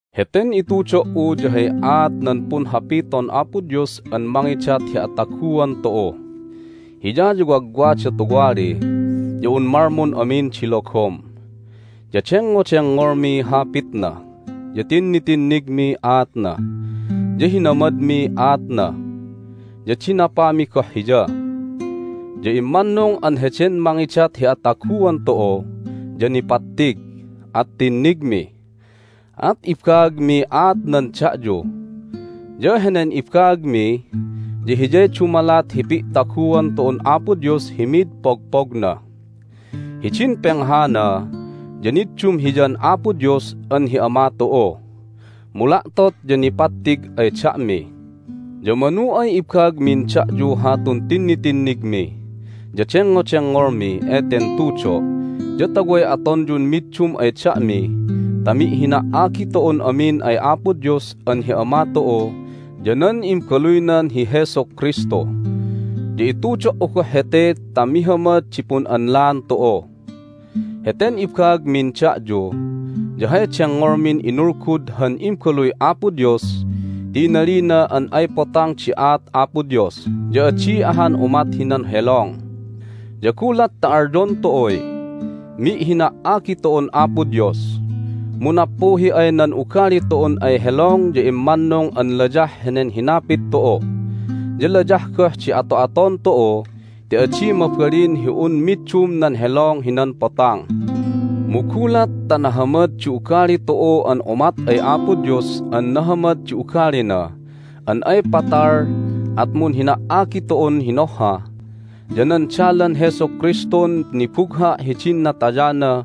Heten itudo"u ya hay aat nan Punhapiton Apo Dios an mangidat hi ataguan tu'u. Hiya ya wagwada tuwali ya un malmun amin di logom. Ya dengngodengngolmiy hapitna, ya tinnitinnigmiy aatna, ya hinamadmiy aatna, ya dinapami goh Hiya. Ya immannung an heden mangidat hi ataguan tu'u ya nipattig, at tinnigmi. At ibaagmiy aatnan da'yu, ya henen ibaagmi ya hiyay dumalat hi pi'taguan tu'un Apo Dios hi mid pogpogna. Hidin penghana ya niddum Hiyan Apo Dios an hi Ama tu'u, mu la'tot ya nipattig ay da'mi. Ya manu ay ibaagmin da'yu hatun tinnitinnigmi ya dengngodengngolmi eten tudo' ya ta way atonyun middum ay da'mi ta mi'hina"agi tu'un amin ay Apo Dios an hi Ama tu'u ya nan Imbaluynan hi Jesus Kristu. Ya itudo"u goh hete ta mihamad di pun'anlaan tu'u. Heten ibaagmin da'yu ya hay dengngolmin inulgud han Imbaluy Apo Dios ti inalina an ay potang di aat Apo Dios, ya adi ahan umat hinan helong. Ya gulat ta alyon tu'uy, "Mi'hina"agi tu'un Apo Dios!" mu nappuhi ay nan ugali tu'un ay helong ya immannung an layah henen hinapit tu'u, ya layah goh di ato'aton tu'u ti adi mabalin hi un middum nan helong hinan potang! Mu gulat ta nahamad di ugali tu'u an umat ay Apo Dios an nahamad di ugalina an ay patal at munhina"agi tu'un hinohha, ya nan dalan Jesu Kristun nibugha' hidin natayana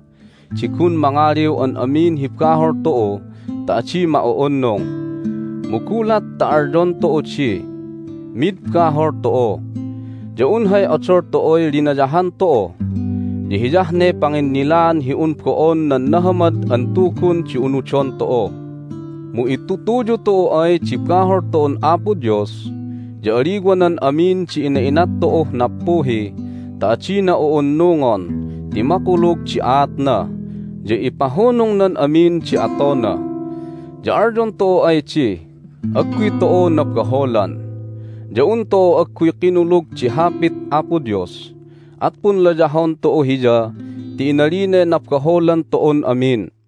di gun mangaliw an amin hi bahol tu'u ta adi ma'u'unnung. Mu gulat ta alyon tu'u di, "Mid bahol tu'u!" ya un hay odol tu'uy linayahan tu'u, ya hiyah ne panginnilaan hi un bo'on nan Nahamad an Tugun di unudon tu'u. Mu itutuyu tu'u ay di bahol tu'un Apo Dios ya aliwanan amin di ina'inat tu'uh nappuhi ta adina u'unnungon ti makulug di aatna, ya ipahunungnan amin di atona. Ya alyon tu'u ay di, "Agguy tu'u nabaholan!" ya un tu'u agguy kinulug di Hapit Apo Dios, at punlayahon tu'u Hiya ti inalinay nabaholan tu'un amin.